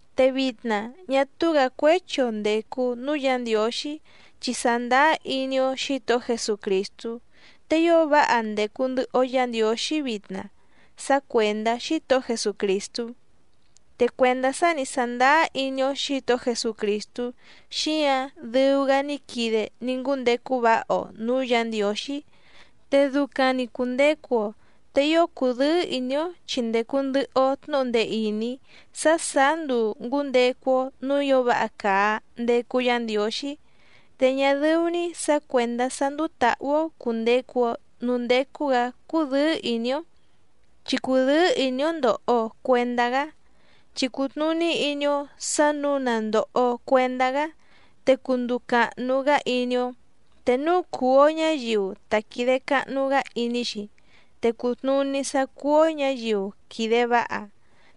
Te vitna, ñá túú‑gǎ cuéchi‑o ndècu núú Yǎ Ndiǒxí chi sàndáá iní‑ó Xǐtohó Jesucrìstú, te ío váha ndècu ndɨhɨ‑o Yá Ndiǒxí vitna sá cuèndá Xítohó Jesucrìstú. Te cuèndá sá ni sàndáá iní‑ó Xǐtohó Jesucrìstú xíǎⁿ dɨu‑gá ní quide ní ngúndecu váha‑o nǔú Yǎ Ndiǒxí, te ducaⁿ‑ni cùndecu‑o, te ío cùdɨ́ɨ́ ìní‑ó chi ndècu ndɨhɨ‑o tnúhu ndee ìní sá sàá nduu ngǔndecu‑o nǔú ǐo váha càa ndecu Yá Ndiǒxí. Te ñá dɨ́ú‑ní sǎ cuèndá sá ndúú tǎhú‑ó cùndecu‑o núú ndécú‑gǎ cúdɨ̌ɨ́ ìní‑ó, chi cùdɨ́ɨ́ ìní‑ó ndòho‑o cuendá‑gá, chi cùtnuní iní‑ó sǎ nǔu na ndòho‑o cuendá‑gá te cunduu càhnu‑gá iní‑ó, te núu cùu‑o ñáyiu ta quìde cahnu‑gá iní‑xi te cùtnuní sá cúú‑ó ñǎyiu quìde váha,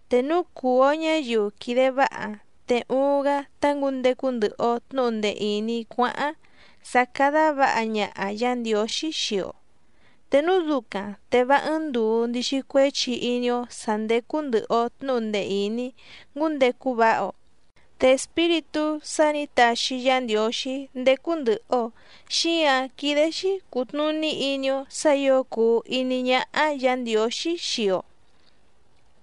te núu cùu‑o ñáyiu quìde váha te uuⁿ‑gá tá ngǔndecu ndɨhɨ‑o tnǔhu ndee ìní cuáháⁿ sá cádá vǎha ñaha Yǎ Ndiǒxí xii‑o. Te núu ducaⁿ te vá ɨ́ɨ́ⁿ ndùu ndixi cuéchi iní‑ó sǎ ndécú ndɨ̀hɨ‑o tnúhu ndee ìní ngúndecu váha‑o. Te Espíritú sá nǐ taxi Yá Ndiǒxí ndécú ndɨ̀hɨ‑o xíǎⁿ quídé‑xí cùtnuní iní‑ó sǎ ǐo cùu iní ñáhá Yǎ Ndiǒxí xii‑o.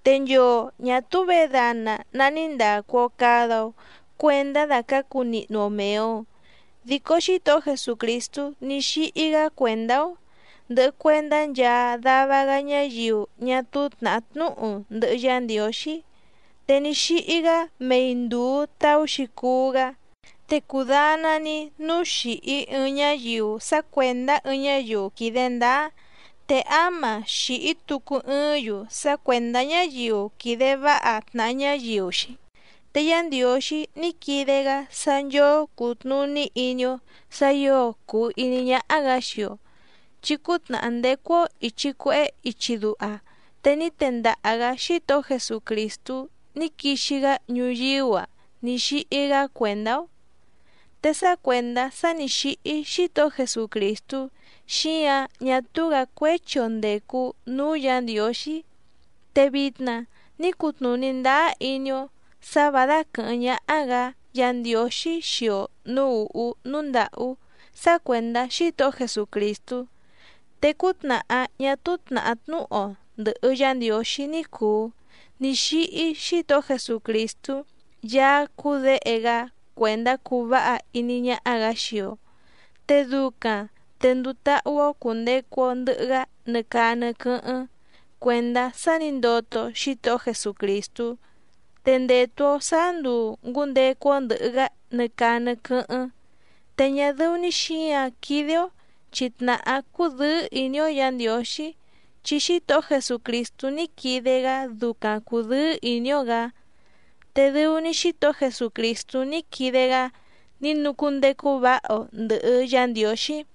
Te nchoo ñà túú vědana ná ní ndàcu‑o cada‑o cuendá dàcácu nihnu‑o mèe‑o, dico Xítohó Jesucrìstú ní xíhí‑gá cuèndá‑ó, ndɨhɨ cuèndá nchaa dava‑gá ñáyiu ñá túú tnàhá tnúhu ndɨhɨ Yá Ndiǒxí, te ní xíhí‑gá mei ndùu taú‑xi cuú‑gá. Te cudana‑ni núu xìhí ɨɨⁿ ñáyiu sá cuèndá ɨɨⁿ ñáyiu quìde ndáá, te áma xìhí tucu ɨɨ́ⁿ‑yu sá cuèndá ñáyiu quìde váha tnàha ñáyiu‑xi. Te Yá Ndiǒxí ní quide‑gá sá nchóó cùtnuní iní‑ó sǎ ǐo cùu iní ñáhá‑gǎ xii‑o, chi cútnàhá ndécú‑ó ìchi cuehé ichi duha te ní tendaha‑gǎ Xítohó Jesucrìstú ní quixi‑gá ñuyíú‑a ní xíhí‑gá cuèndá‑ó. Te sá cuèndá sá nǐ xíhí Xítohó Jesucrìstú xíǎⁿ ñá túú‑gǎ cuéchi‑o ndècu núú Yǎ Ndiǒxí, te vitna ní cutnùní ndáá iní‑ó sǎ vǎ dáquɨ̀hɨ́ⁿ ñáhá‑gǎ Yǎ Ndiǒxí xii‑o nǔú ùhú núú ndàhú sá cuèndá Xítohó Jesucrìstú. Te cútnàhá ñá túú tnàhá tnúhu‑o ndɨ̀hɨ Yá Ndiǒxí ní cùu ní xíhí Xítohó Jesucrìstú Yaá cúú Děhe‑gá cuèndá cuu váha iní ñáhá‑gǎ xii‑o, te ducaⁿ te nduu táhú‑ó cùndecu‑o ndɨhɨ‑gá nɨ caa nɨ quɨ́hɨ́ⁿ cuèndá sá nǐ ndoto Xítohó Jesucrìstú. Te ndètu‑o sáá nduu ngǔndecu‑o ndɨ̀hɨ‑gá nɨ caa nɨ quɨ́hɨ́ⁿ, te ñá dɨ́ú‑ní xǐǎⁿ quídé‑ó chi tnàhá cúdɨ̌ɨ́ ìní‑ó Yǎ Ndiǒxí, chi Xítohó Jesucrìstú ní quide‑gá ducaⁿ cùdɨ́ɨ́ ìní‑ó‑gǎ, te dɨu‑ni Xítohó Jesucrìstú ní quide‑gá ní nucúndecu váha‑o ndɨ̀hɨ Yá Ndiǒxí.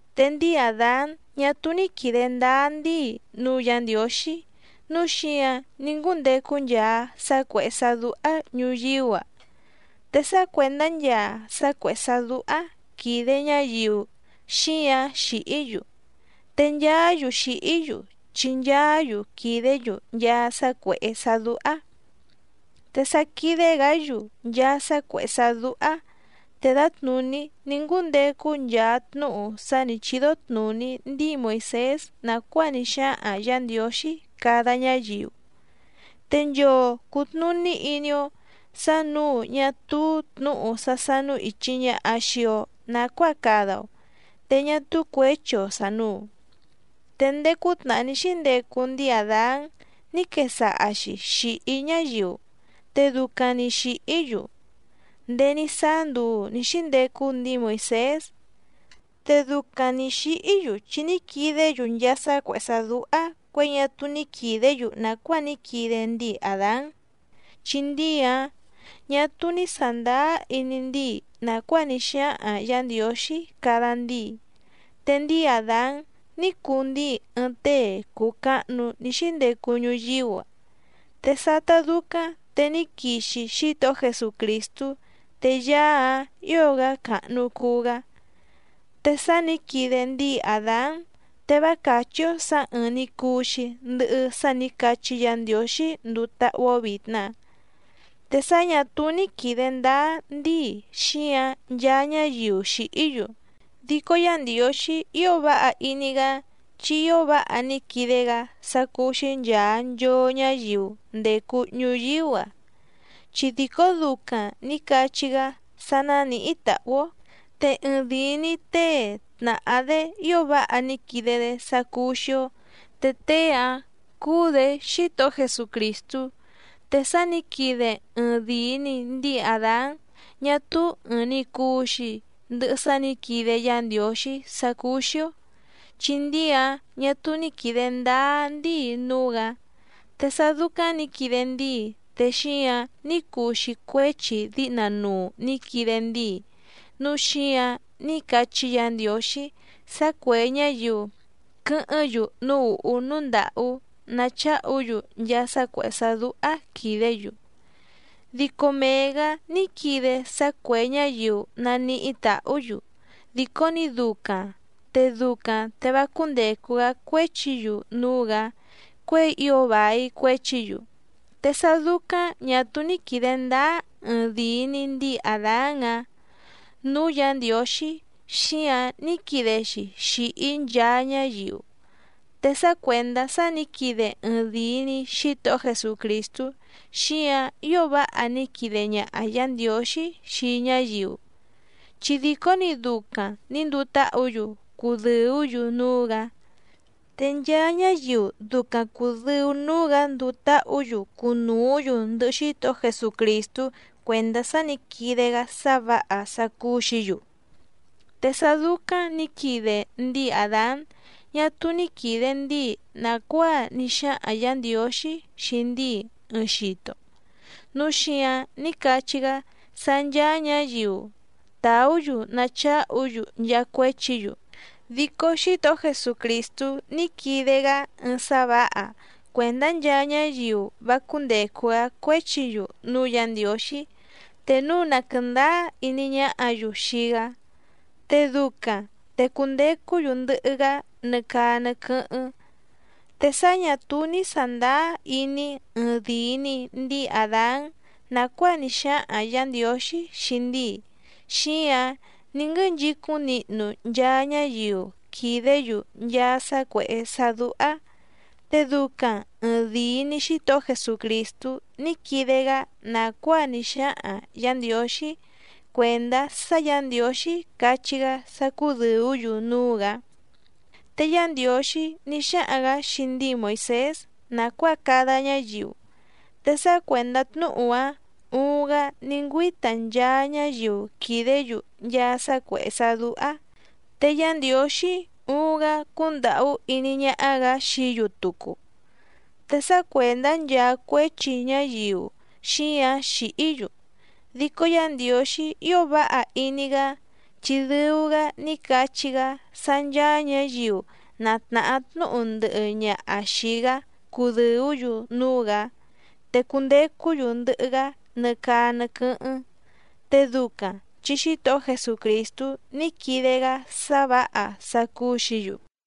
Te ndíi Àdán ñá túú ní quìde ndáá ndíi núú Yǎ Ndiǒxí nǔu xíǎⁿ ní ngúndecu nchaa sá cuèhé sá dúhá ñùyíú‑a, te sá cuèndá nchaa sá cuèhé sá dúhá quìde ñáyiu xíǎⁿ xìhí‑yu, te nchaá‑yu xìhí‑yu chi nchaá‑yu quìdé‑yu nchaa sá cuèhé sá dúhá. Te sa quìde‑gá‑yu nchaa sá cuèhé sá dúhá te dǎtnùní ní ngúndecu nchaa tnúhu sá nǐ chídó tnùní ndíi Moìsés nàcuáa ní xáhaⁿ Yǎ Ndiǒxí cada ñáyiu, te nchoo cùtnuní iní‑ó sǎ nǔu ñá túú tnǔhu sá sánú ìchi ñaha xii‑o nacuáa cada‑o, te ñá túú cuěchi‑o sànuu. Te ndéé cútnàhá ní xíndecu ndíi Àdán ní quesaha‑xi xìhí ñáyiu, te ducaⁿ‑ni xìhí‑yu ndéé ní sáá nduu nǐ xíndecu ndíi Moìsés. Te ducaⁿ nǐ xíhí‑yu chi ní quidé‑yu nchaa sá cuèhé sá dúhá cuěi ñá túú ní quìdé‑yu nàcuáa ní quide ndíi Àdán, chi ndíi‑áⁿ ñà túú ní sàndáá iní ndíi nàcuáa ní xáhaⁿ Yǎ Ndiǒxí cada ndíi. Te ndíi Àdán ní cuu ndíi ɨɨⁿ tée cùu cahnu ní xíndecu ñuyíú‑a, te sátá dúcáⁿ te ní quixi Xítohó Jesucrìstú te Yaá‑áⁿ ǐo‑gá càhnu cuu‑gá. Te sá nǐ quide ndíi Àdán te vá càchí‑ó sǎ ɨ́ɨ́ⁿ‑ní cùu‑xi ndɨhɨ sá nǐ cachí Yǎ Ndiǒxí nduu táhú‑ó vìtna. Te sá ñà túú ní quìde ndáá ndíi xíǎⁿ nchaa ñáyiu xìhí‑yu, dico Yá Ndiǒxí ío váha iní‑gá chi ío váha ní quide‑gá sá cúú‑xí nchàa nchoo ñáyiu ndècu ñuyíú‑a, chi dìcó ducaⁿ nǐ cachí‑gá sá nánìhí tàhú‑ó, te ɨɨⁿdìi‑ni tée tnàhá‑dé ío váha ní quide‑dé sá cúú‑xí‑ó, te tée‑áⁿ cúú‑dě Xítohó Jesucrìstú. Te sá nǐ quide ɨɨⁿdìi‑ni ndíi Àdán ñá túú ɨ̀ɨⁿ‑ni cuu‑xi ndɨhɨ sá nǐ quide Yá Ndiǒxí sá cúú‑xí‑ó, chi ndíi‑áⁿ ñà túú ní quìde ndáá ndíi núú‑gǎ. Te sá dúcáⁿ nǐ quide ndíi te xíǎⁿ ní cuu‑xi cuéchi díhna nuu nǐ quide ndíi, núu xíǎⁿ ní cachí Yǎ Ndiǒxí sá cuè ñáyiu quɨ́hɨ́ⁿ‑yu núú ùhú núú ndàhú nacháhu‑yu nchaa sá cuèhé sá dúhá quìdé‑yu. Dico mee‑gǎ ní quide sá cuè ñáyiu naníhí tàhú‑yu dìcó‑ni ducaⁿ, te ducaⁿ te vá cúndècu‑gá cuéchi‑yu núú‑gǎ cuěi ío vài cuéchi‑yu. Te sá dúcáⁿ ñà túú ní quìde ndáá ɨɨⁿdìi‑ni ndíi Àdán‑áⁿ nǔú Yǎ Ndiǒxí, xíǎⁿ ní quide‑xi xìhí nchaa ñáyiu. Te sá cuèndá sá nǐ quide ɨɨⁿdìi‑ni Xítohó Jesucrìstú xíǎⁿ ío váha ní quide ñaha Yǎ Ndiǒxí xii ñáyiu, chi dìcó‑ni ducaⁿ nǐ nduu táhǔ‑yu cùdɨú‑yu núú‑gǎ. Te nchaa ñáyiu ducaⁿ cùdɨu núú‑gǎ nduu táhǔ‑yu cunùú‑yu ndɨhɨ Xítohó Jesucrìstú cuèndá sá nǐ quide‑gá sá vǎha sá cúú‑xǐ‑yu. Te sá dúcáⁿ nǐ quide ndíi Àdán ñá túú ní quìde ndíi nàcuáa ní xáhaⁿ Yǎ Ndiǒxí xii ndíi ɨɨⁿ xito, núu xíǎⁿ ní cachí‑gá sá ncháá ñǎyiu tàú‑yu nacháhu‑yu nchaa cuéchi‑yu, dico Xítohó Jesucrìstú ní quide‑gá ɨɨⁿ sá vǎha cuèndá nchaa ñáyiu vá cúndècu‑gá cuéchi‑yu núú Yǎ Ndiǒxí te núu na quɨ̀ndáá iní ñáhǎ‑yu xii‑gá, te ducaⁿ te cundecú‑yu ndɨhɨ‑gá nɨ caa nɨ quɨ́hɨ́ⁿ. Te sá ñà túú ní sàndáá iní ɨɨⁿdìi‑ni ndíi Àdán nàcuáa ní xáhaⁿ Yǎ Ndiǒxí xii ndíi, xíǎⁿ ní nguɨ́nchicúⁿ nihnu nchaa ñáyiu quìdé‑yu nchaa sá cuèhé sá dúhá. Te ducaⁿ ɨ̀ɨⁿdii‑ni Xítohó Jesucrìstú ní quide‑gá nàcuáa ní xáhaⁿ Yǎ Ndiǒxí cuèndá sá Yǎ Ndiǒxí cachí‑gá sá cúdɨ̀ú‑yu núú‑gǎ. Te Yá Ndiǒxí ní xáhaⁿ‑gǎ xii ndíi Moìsés nàcuáa cada ñáyiu, te sá cuèndá tnúhu‑áⁿ uuⁿ‑gá ní ngüíta nchaa ñáyiu quìdé‑yu nchaa sá cuèhé sá dúhá, te Yá Ndiǒxí uuⁿ‑gá cúndàhú iní ñáhá‑gǎ xií‑yu tucu. Te sá cuèndá nchaa cuéchi ñáyiu xíǎⁿ xìhí‑yu, dico Yá Ndiǒxí ío váha iní‑gá chi dɨu‑gá ní cachí‑gá sá ncháá ñǎyiu na tnàhá tnúhu ndɨhɨ ñaha xìi‑gá cudɨ̀ú‑yu núú‑gǎ, te cundecú‑yu ndɨhɨ‑gá nɨ caa nɨ quɨ́hɨ́ⁿ, te ducaⁿ chi Xítohó Jesucrìstú ní quide‑gá sá vǎha sá cúú‑xǐ‑yu.